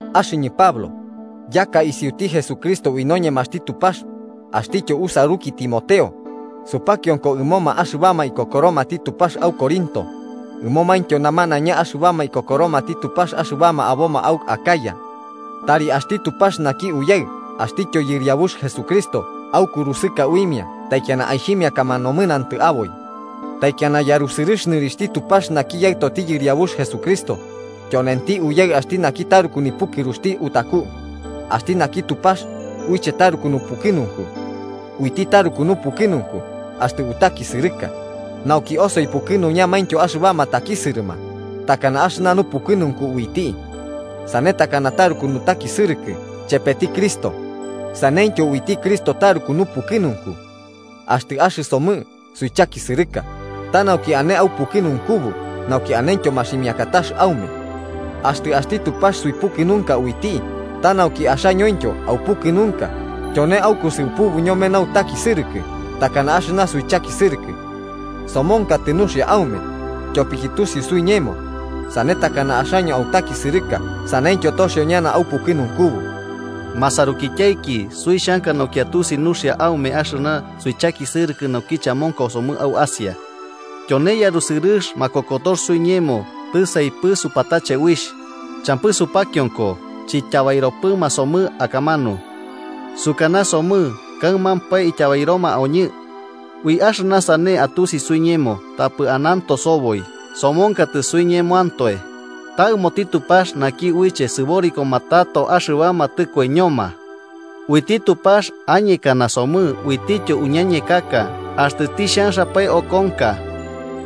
Axɨñɨ Pablo, yaka isiuti Jesucristo ui noñemaxti Tupax, axtityo usaruki Timoteo, supakionko ɨmoma axɨbama ikokoromati Tupax au Corinto, ɨmomaintyo namanaiña axɨbama ikokoromati Tupax axɨbama aboma au Acaya. Tari axti Tupax naki Uyaɨ axtityo Yɨriabux Jesucristo aukurusɨka uimia taikiana aixhimiakama nomɨnantɨ aboi. Taikiana yarusɨrɨx nɨrixhti Tupax naki Yaɨtoti Yɨriabux Jesucristo, tyonenti Uyaɨ axti naki taruku nipukɨruxti utaku, axti naki Tupax uiche taruku nupukɨnunku. Uiti taruku nupukɨnunku axtɨ utakisɨrɨka, nauki osoi pukɨnuñamaintyo axɨbama takisɨrɨma, takana axɨna nupukɨnunku uiti. Sane takana taruku nutakisɨrɨkɨ chepeti Cristo, saneityo uiti Cristo taruku nupukɨnunku. Axtɨ axɨsomɨ suichakisɨrɨka, ta nauki ane aupukɨnunkubu nauki anentyo maximiakatax aume. Axtɨ axti Tupax suipukɨnunka uiti ta nauki axañointyo aupukɨnunka tyone aukusɨupubu ñome nautakisɨrɨkɨ takana axɨna suichakisɨrɨkɨ. Somonkatɨ nuxia aume, tyopiki tusiu suiñemo, sane takana axaño autakisɨrɨka saneityo toxio ñana aupukɨnunkubu. Masarukityaiki, suixhanka nauki atusi nuxia aume axɨna suichakisɨrɨkɨ naukiche amonkosomɨ au Asia. Tyone yarusɨrɨx makokotox suiñemo tisaipɨ supatache uixh, champɨ supakionko chityabairopɨma somɨ akamanu. Sukanasomɨ kaɨmampae ityabairoma oñɨ. Ui axɨna sane atusi suiñemo tapɨ ananto soboi somonkatɨ suiñemoantoe, ta ɨmoti Tupax naki uiche sɨborikoma tato axɨbama tɨkoiñoma. Uiti Tupax añekana somɨ uitityo uñañekaka axtɨ tixhanxapae okonka.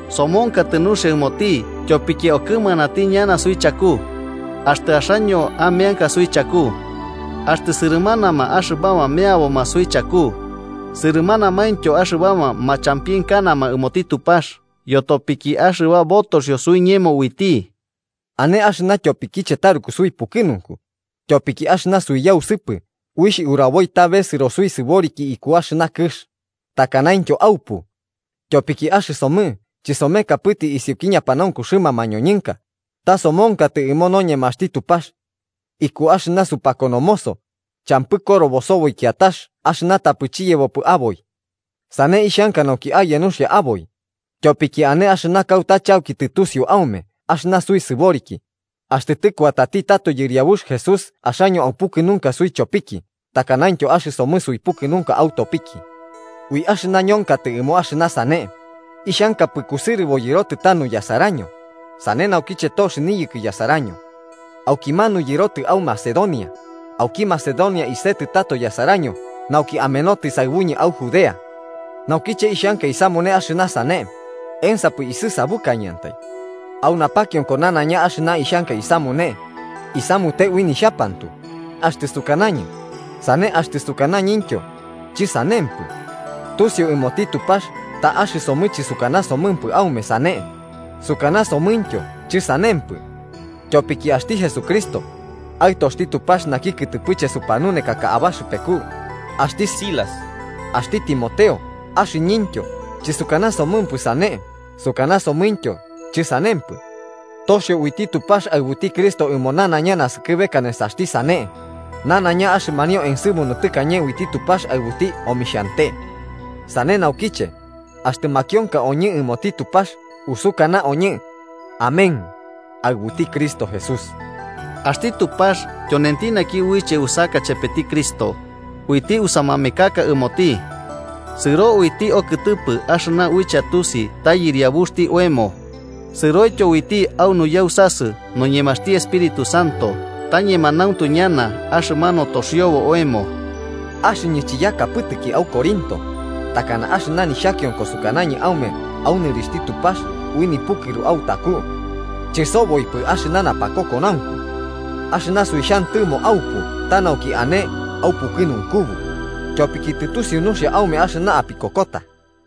Somonkatɨ nuxia ɨmoti tyopiki okɨmanatiki ñana suichaku, axtɨ axaño ameanka suichaku. Axtɨ sɨrɨmanama axɨbama meaboma suichaku, sɨrɨmanamaintyo axɨbama machampienkanama ɨmoti Tupax yotopiki axɨba botoxio suiñemo uiti. Ane axɨna tyopikiche taruku suipukɨnunku, tyopiki axɨna suiyausɨpɨ uixh uraboi ta besɨro suisɨboriki iku axɨna kɨx, takanaintyo aupu. Tyopiki axɨsomɨ chisomekapɨtɨ isiuki ñapanaunkuxɨma mañoñɨnka, ta somonkatɨ ɨmo noñemaxti Tupax. Iku axɨna supakonomoso, champɨ korobo soboi kiatax axɨna tapɨ chiyebopɨ aboi. Sane ixhanka nauki aye nuxia aboi, tyopiki ane axɨna kauta chauki tɨtusiu aume axɨna suisɨboriki, axtɨ tɨkuatati tato Yɨriabux Jesús axaño aupukɨnunka suichopiki takanaintyo axɨsomɨ suipukɨnunka autopiki. Ui axɨna ñonkatɨ ɨmo axɨna sane, ixhankapɨ kusɨrɨbo yɨrotɨ tanu yasaraño, sane nauki tox niyɨkɨ yasaraño. Aukimanu yɨrotɨ au Macedonia, auki Macedonia isetɨ tato yasaraño nauki amenotɨ saɨbuñɨ au Judea. Naukiche ixhanka isamune axɨna sane, ¿ensapɨ isɨsabukañɨantai? Au napakionko nanaiña axɨna ixhanka isamune, isamute ui nixhapantu, axtɨ sukanañɨ “sane” axtɨ sukanañɨntyo “chɨsanempɨ.” Tusiu ɨmoti Tupax ta axɨsomɨ chɨsukanasomɨmpɨ aume “sane” sukanasomɨntyo “chɨsanempɨ.” Tyopiki axti Jesucristo, Aɨtoxti Tupax naki kɨtɨpɨche supanunekaka abaxɨpeku, axti Silas, axti Timoteo axɨñɨntyo chɨsukanasomɨmpɨ “sane” sukanasomɨntyo “chɨsanempɨ.” Toxio uiti Tupax aɨbuti Cristo ɨmo nanaiña naskɨbeka nesaxti “sane”, nanaiña axɨmanio ensɨmunu tɨkañe uiti Tupax aɨbuti omixhante. Sane naukiche, axtɨ makionka oñɨ ɨmoti Tupax, usukanaoñɨ “Amén” aɨbuti Cristo Jesús. Axti Tupax tyonenti naki uiche usaka chepeti Cristo, uiti usamamekaka ɨmoti. Sɨro uiti okɨtɨpɨ axɨna uiche atusi ta Yɨriabuxti oemo, sɨroityo uiti a nuyausasɨ noñemaxti Espíritu Santo ta ñemanauntu ñana axɨmanu toxiobo oemo. Axɨñɨ chiyakapɨtɨki au Corinto, takana axɨna nixhakionko, sukanañɨ aume au nɨrixhti Tupax ui nipukɨru autaku. Chɨsoboipɨ axɨna napakokonaunku. Axɨna suixhantɨmo aupu ta nauki ane aupukɨnunkubu, tyopiki tɨtusiu nuxia aume axɨna apikokota.